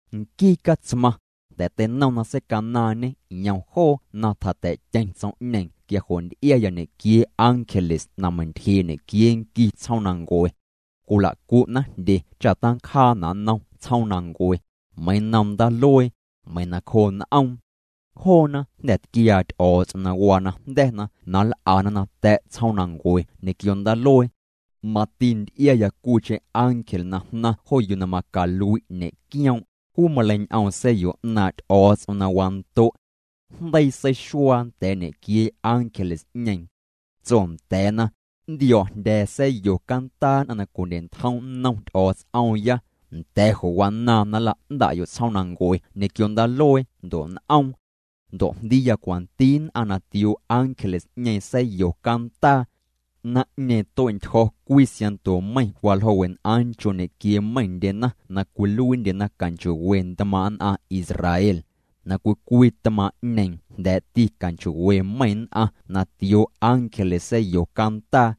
Nquii Catsmaⁿ, jnda̱ teinom na seicanaaⁿñê yom joo na tjata̱'tyeⁿ tsom'ñeeⁿ quia jo' nty'iaya ñequiee ángeles na meiⁿ'ntyjee' ñequiee nqui tsjoomnancue. Cwila'cu'na jndye cha tancjaana' nnom tsjoomnancue, meiⁿ nnom ndaaluee, meiⁿ nacjoo n'oom. Joona jnda̱ tquiaa Ty'o̱o̱ts'om na waa najnda̱na na nl'ana nata̱' tsjoomnancue ñequio ndaaluee. Mati nty'iaya cwiicheⁿ ángel na jnaⁿ jo yuu na macalui' ñe'quioom', juu maleiñ'oom sa̱yo 'naaⁿ' Ty'o̱o̱ts'om na wando'. Jndeii seixuaa nda̱a̱ ñequiee ángeles'ñeeⁿ. Tso nda̱a̱na: —Nntio̱o̱jndya̱a̱ sa̱yo cantaa nn'aⁿ na cwindye'ntjom nnom Ty'o̱o̱ts'oomya, nda̱ jo' wanaaⁿ na nla'nda'yo' tsjoomnancue ñequio ndaaluee ndo' n'oom. Ndo' jndiiya cwanti nn'aⁿ na tioo ángeles'ñeeⁿ sa̱yo cantaa. Naⁿ'ñeeⁿ tue'ntyjo̱ cwii siaⁿnto meiⁿ waljoo' wen'aaⁿ nchoo' ñequiee meiⁿndyena na cwiluiindyena canchoo'we ntmaaⁿ' nn'aⁿ Israel. Na cwii cwii tmaaⁿ'ñeeⁿ jnda̱a̱'ti canchoo'we meiⁿ nn'aⁿ na tioo ángeles sa̱a̱yo cantaa.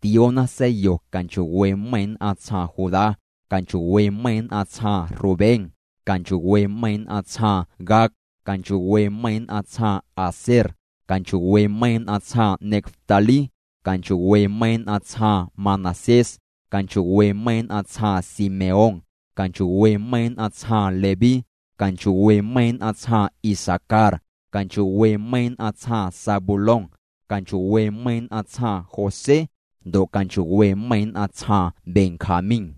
Tioona sa̱a̱yo canchoo'we meiⁿ nn'aⁿ tsjaaⁿ Judá, canchoo'we meiⁿ nn'aⁿ tsjaaⁿ Rubén, canchoo'we meiⁿ nn'aⁿ tsjaaⁿ Gad, canchoo'we meiⁿ nn'aⁿ tsjaaⁿ Aser, canchoo'we meiⁿ nn'aⁿ tsjaaⁿ Neftalí, canchoo'we meiⁿ nn'aⁿ tsjaaⁿ Manasés, canchoo'we meiⁿ nn'aⁿ tsjaaⁿ Simeón, canchoo'we meiⁿ nn'aⁿ tsjaaⁿ Leví, canchoo'we meiⁿ nn'aⁿ tsjaaⁿ Isacar, canchoo'we meiⁿ nn'aⁿ tsjaaⁿ Zabulón, canchoo'we meiⁿ nn'aⁿ tsjaaⁿ José, ndo' canchoo'we meiⁿ nn'aⁿ tsjaaⁿ Benjamín.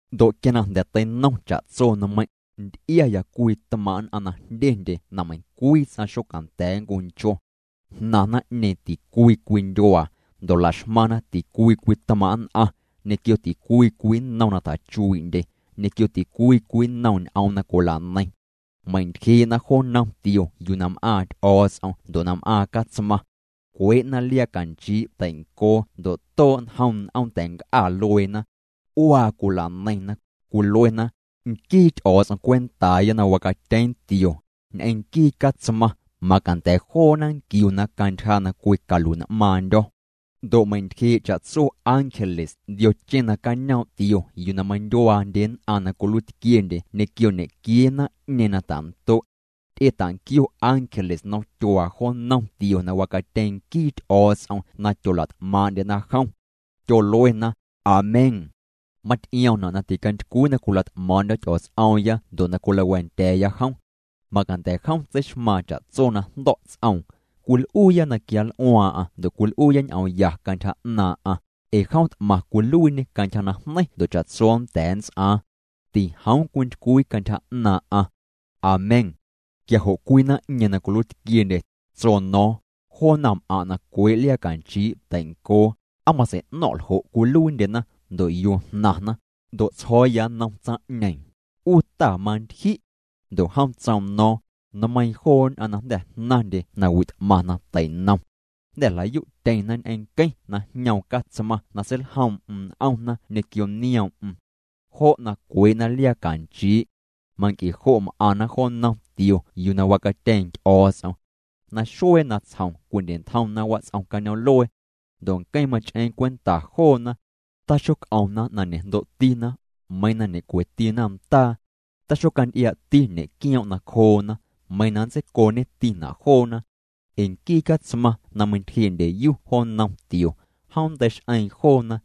Ndo' quia na jnda̱ teinom cha'tso nmeiⁿ', nty'iaya cwii tmaaⁿ' nn'aⁿ na jndyendye na meiⁿcwii ts'aⁿ xocanda̱a̱ nncuncho. Jnaⁿ naⁿ'ñeeⁿ ticwii cwii ndyuaa, ndo' la'xmaⁿna ticwii cwii tmaaⁿ' nn'aⁿ, ñequio ticwii cwii nnom na tjachuii'ndye, ñequio ticwii cwii nnom ñ'oom na cwila'neiⁿna. Meiⁿ'ntyjee'na jo nnom tio yuu na m'aaⁿ Ty'o̱o̱ts'om ndo' na m'aaⁿ Catsmaⁿ. Cwee'na liaa canchii' teincoo ndo' too' njom n'oom ta̱nc'a lueena. C'uaa cwila'neiⁿna, cwiluena: Nquii Ty'o̱o̱ts'om cwentaaya na wacatyeeⁿ tio, ñ'eⁿ nquii Catsmaⁿ, macanda̱ joona nquiuna cantyja na cwicalui'n'maaⁿndyo̱. Ndo' meiⁿ'ntyjee' cha'tso ángeles ndiocheⁿ nacañoom' tio yuu na meindyuaandye nn'aⁿ na cwiluiitquiendye ñequio ñequiee naⁿ'ñeeⁿ na ta'ndo'. Ty'etanquio ángeles nnomtyuaa jo nnom tio na wacatyeeⁿ nquii Ty'o̱o̱ts'om na tyola't'maaⁿ'ndyena jom. Tyoluena: Amén. Maty'iomna' na ticantycwii na cwila't'maaⁿ'ndyo̱ Ty'o̱o̱ts'oomya ndo' na cwilawa̱a̱ndya̱a̱ya jom. Macanda̱ jom tseixmaaⁿ cha'tso na jndo̱' ts'oom. Cwil'uuya na quianl'uaaⁿ'aⁿ ndo' cwil'uuya ñ'oom ya cantyja 'naaⁿ'aⁿ, ee jom t'maⁿ cwiluiiñê cantyja najneiⁿ ndo' cha'tso nnda̱a̱ nnts'aaⁿ. Tijoom cwintycwii cantyja 'naaⁿ'aⁿ. Amén. Quia jo' cwii naⁿ'ñeeⁿ na cwiluiitquiendye, tso no̱o̱ⁿ: —Joo naⁿm'aⁿ' na cwee' liaa canchii' teincoo, ¿aa matsei'no̱ⁿ' ljo' cwiluiindyena, ndo' yuu jnaⁿna? Ndo' tsjo̱o̱ya nnom tsaⁿ'ñeeⁿ: —'U ta, mantyji'. Ndo' jom tsoom no̱o̱ⁿ: —Nmeiiⁿ joo nn'aⁿ na jnda̱ jnaⁿndye nawi' t'maⁿ na tei'nom. Jnda̱ jla'yu'tyeⁿna ñ'eⁿ nqueⁿ na jñoom Catsmaⁿ na seiljoom'm n'omna ñequio nioom'm. Jo' na cwee'na liaa canchii'. Manc'e jo' m'aⁿna jo nnom tio yuu na wacatyeeⁿ Ty'o̱o̱ts'om. Naxuee natsjom cwindye'ntjomna wats'om cañoom'luee. Ndo' nqueⁿ mach'eeⁿ cwenta joona. Taxoc'omna na ñe'jndo'tina, meiⁿ na ñe'cwetina ndaa. Taxocanty'iaa'ti ñe'quioom' nacjoona, meiⁿ na nntseicooñetina' joona. Ee nquii Catsmaⁿ na meintyjee' ndyeyu jo nnom tio, jom nnteix'eeⁿ joona.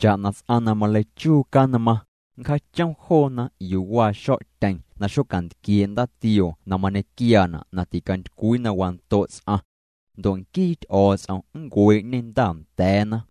Cha'na ts'aⁿ na maleichuu canmaⁿ, nncjaachom joona yuu waa xo̱'tyeⁿ na xocantquiee' ndaatioo na mañequiaana' na ticantycwii na wando' ts'aⁿ. Ndo' nquii Ty'o̱o̱ts'om nncuee'ñê ndaanda̱a̱na.